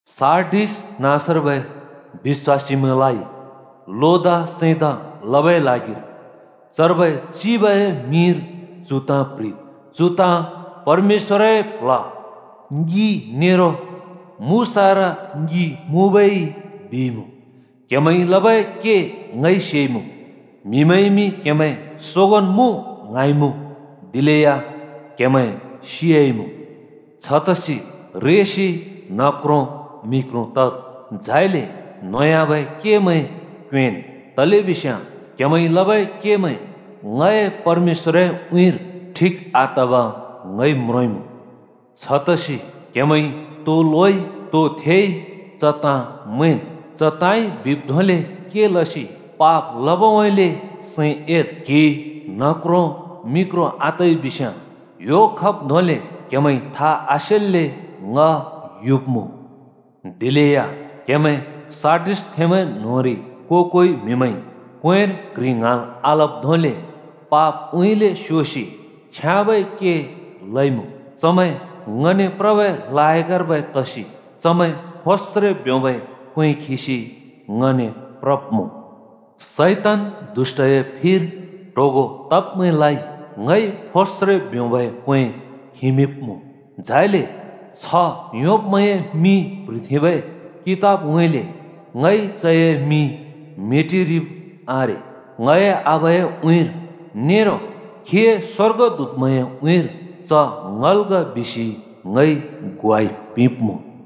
“सार्डिस नाँसर्बै बिश्‍वासीमैंलाइ लोदा सैंदा लबै ल्हागिर चर्बै चिबए मिंर चु ताँ प्‍ह्रिद् बिसि येशूजी यूहन्‍नाने ल्हैदिइ: “चु ताँ परमेश्‍वरए प्ल्ह ङि नेरो मुसारा ङि मुँबै येशूजी बिइमुँ: क्‍हेमैंइ लबै के ङइ सेइमुँ। म्हिमैंइमि क्‍हेमैं सोगोंन् मुँ ङ्हाँइमुँ, दिलेया क्‍हेमैं सियाइमुँ। छतसि रेसि न्ह क्रों मि क्रों तद्, झाइले न्होंयाबै केमैं क्योंएँन्। तलेबिस्याँ क्‍हेमैंइ लबै केमैं ङए परमेश्‍वरए उँइँर ठिक आतब ङइ म्रोंइमुँ। छतसि क्‍हेमैंइ तो लोइ, तो थेइ, च ताँ मैंन्। च ताँइ बिब् धोंले के लसि पाप लबउँइँले सैं एद्। क्‍हि न्ह क्रों मि क्रों आतइबिस्याँ ह्‍यो खब् धोंले क्‍हेमैंइ था आसेल्‍ले ङ युब्‍मुँ। दिलेया क्‍हेमैं सार्डिसथेंमैं न्‍होंरि को-कोइ म्‍हिमैंइ क्‍वेंर क्‍ह्रि ङ्हाँल् आलब् धोंले पापउँइँले स्‍योसि छ्याँबै के लइमुँ। चमैं ङने प्रबै लायकर्बै तसि चमैं फोस्रे ब्योंबै क्‍वें खिसि ङने प्रब्मुँ। “शैतान दुष्‍टए फिर ट्होगों तब्मैंलाइ ङइ फोस्रे ब्योंबै क्‍वें खिमिंब्‍मुँ। झाइले छ्ह योंब्‍मैंए मिं प्‍ह्रिथेंबै कितबउँइँले ङइ चए मिं मेटिरिब आरे। ङए आबाए उँइँर नेरो खीए स्‍वर्गदूतमैंए उँइँर ‘च ङल् ग’ बिसि ङइ ग्वाइ पिंब्‍मुँ।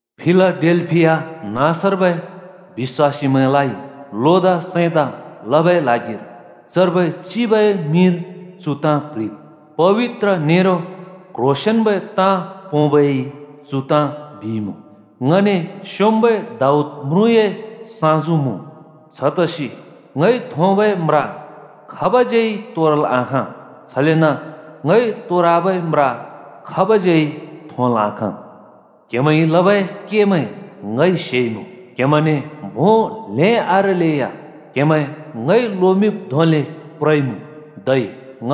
“फिलाडेल्‍फिया नाँसर्बै बिश्‍वासीमैंलाइ लोदा सैंदा लबै ल्हागिर चर्बै चिबए मिंर चु ताँ प्‍ह्रिद् बिसि येशूजी यूहन्‍नाने ल्हैदिइ: “पबित्र नेरो क्ह्रोंसेंन्बै ताँ पोंबै येशूजी चु ताँ बिइमुँ: ङने स्‍योंम्‍बै दाऊद म्रुँए साँजु मुँ। छतसि ङइ थोंबै म्रा खाबज्‍यै तोरल् आखाँ, छलेन ङइ तोरबै म्रा खाबज्‍यै थोंल् आखाँ। क्‍हेमैंइ लबै केमैं ङइ सेइमुँ। क्‍हेमैंने भों ल्हें आरेलेया क्‍हेमैं ङइ लोमिंब् धोंले प्रइमुँ, धै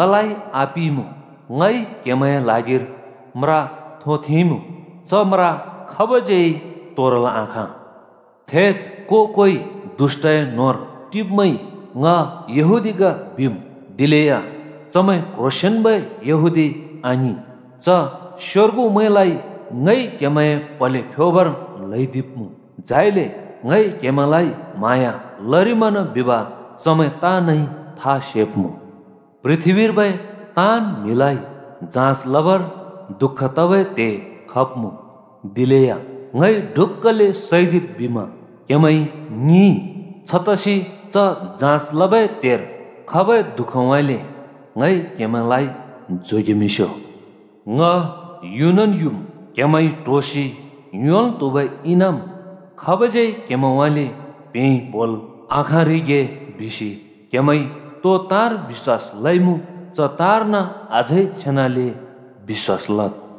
ङलाइ आपिइमुँ। ङइ क्‍हेमैंए ल्हागिर म्रा थोंथेंइमुँ, च म्रा खाबज्‍यै तोरल् आखाँ। थेद्, को-कोइ दुष्‍टए न्होंर टिब्मैंइ ‘ङ यहूदी ग’ बिम् दिलेया चमैं क्ह्रोंसेंन्बै यहूदी आङिं। च स्‍योर्गुमैंलाइ ङइ क्‍हेमैंए प्‍हले फ्‍योबर ल्‍हैदिब्‍मुँ। झाइले ङइ क्‍हेमैंलाइ म्हाँया लरिमना बिब चमैं ताँनइ था सेब्‍मुँ। पृथ्‍बीर्बै ताँन् म्हिलाइ जाँच लबर दुःख तबै त्हे खब्‍मुँ। दिलेया ङइ ‘ढुक्‍कले सैदिद्’ बिमा क्‍हेमैंइ ङिंइ, छतसि च जाँच लबै त्हेर खबै दु:खउँइँले ङइ क्‍हेमैंलाइ जोगेमिंस्‍यो। ङ युनन् युम्। क्हेमैंइ ट्होसि योंल् त्हुबै इनाम खाबज्‍यै क्हेमैंउँइँले प्‍हेंइ बोल् आखाँरिगे बिसि क्हेमैंइ तो ताँर बिश्‍वास लइमुँ, च ताँर्न अझै छेनाले बिश्‍वास लद्।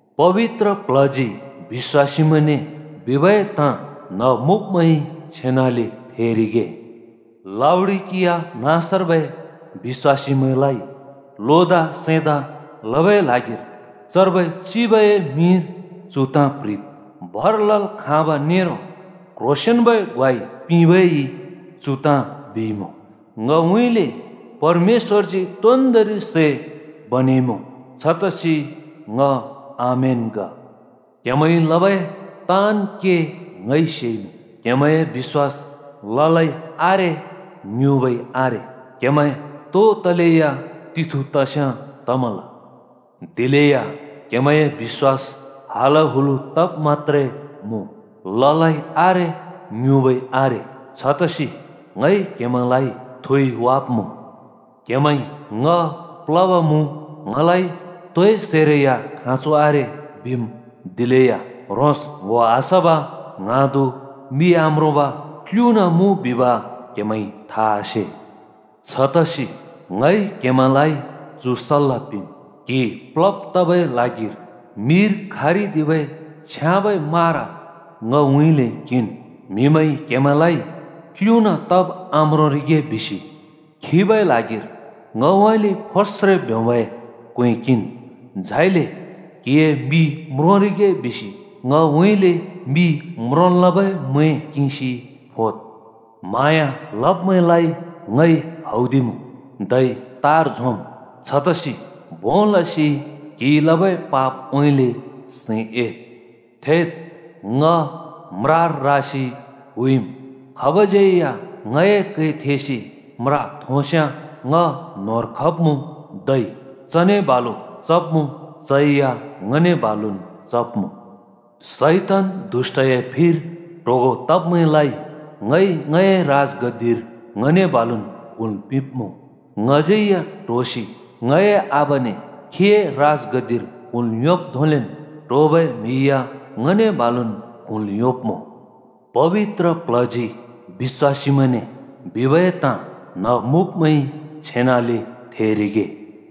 “पबित्र प्ल्हजी बिश्‍वासीमैंने बिबै ताँ न्‍ह मुँब्मैंइ छेनाले थेरिगे। “लाउडिकिया नाँसर्बै बिश्‍वासीमैंलाइ लोदा सैंदा लबै ल्हागिर चर्बै चिबए मिंर चु ताँ प्‍ह्रिद् बिसि येशूजी यूहन्‍नाने ल्हैदिइ: “भर लल् खाँब नेरो क्ह्रोंसेंन्बै ग्वाइ पिंबै येशूजी चु ताँ बिइमुँ: ङउँइँले परमेश्‍वरजी तोन्दोंरि सै बनेइमुँ, छतसि ङ आमेन ग। क्हेमैंइ लबै ताँन् के ङइ सेइमुँ। क्हेमैंए बिश्‍वास ललै आरे, ङ्युँबै आरे। क्हेमैं तो तलेया तिथु तस्याँ तमल। दिलेया क्हेमैंए बिश्‍वास हलहलु तब् मत्‍त्रे मुँ, ललै आरे, ङ्युँबै आरे। छतसि ङइ क्हेमैंलाइ थुइवाब्मुँ। क्हेमैंइ ‘ङ प्लब मुँ, ङलाइ तोए सैरै या खाँचो आरे,’ बिम्। दिलेया ह्रोंस् ङ्‍हो आसब, ङ्हाँदु, मि आम्रोंब, क्‍लुना मुँ बिब क्‍हेमैंइ था आसे। छतसि ङइ क्हेमैंलाइ चु सल्‍ला पिंम्: क्‍हि प्लब् तबै ल्हागिर मिर खारदिबै छ्याँबै मारा ङउँइँले किंन्, म्‍हिमैंइ क्‍हेमैंलाइ क्‍लुना तब् आम्रोंरिगे बिसि खिबै ल्हागिर ङउँइँले फोस्रे ब्योंबै क्‍वें किंन्, झाइले क्‍हिए मि म्रोंरिगे बिसि ङउँइँले मि म्रोंल् लबै मैं किंसि फोद्। म्हाँया लब्मैंलाइ ङइ हौदिमुँ, धै तार झोंम्। छतसि भों लसि क्‍हिइ लबै पापउँइँले सैं एद्। थेद्, ङ म्रार रासि हुइमुँ। खाबज्‍यै या ङए कै थेसि म्रा थोंस्‍याँ ङ न्‍होंर खब्मुँ, धै चने बालु चब्‍मुँ, चै या ङने बालुन् चब्‍मुँ। “शैतान दुष्‍टए फिर ट्होगों तब्मैंलाइ ङइ ङए राजगद्दिर ङने बालुन् क्हुँल् पिंब्‍मुँ। ङज्‍यै या ट्होसि ङए आबाने खीए राजगद्दिर क्हुँल् योंब् धोंलेन् ट्होबै म्‍हि या ङने बालुन् क्हुँल् योंब्‍मुँ। “पबित्र प्ल्हजी बिश्‍वासीमैंने बिबै ताँ न्‍ह मुँब्मैंइ छेनाले थेरिगे।”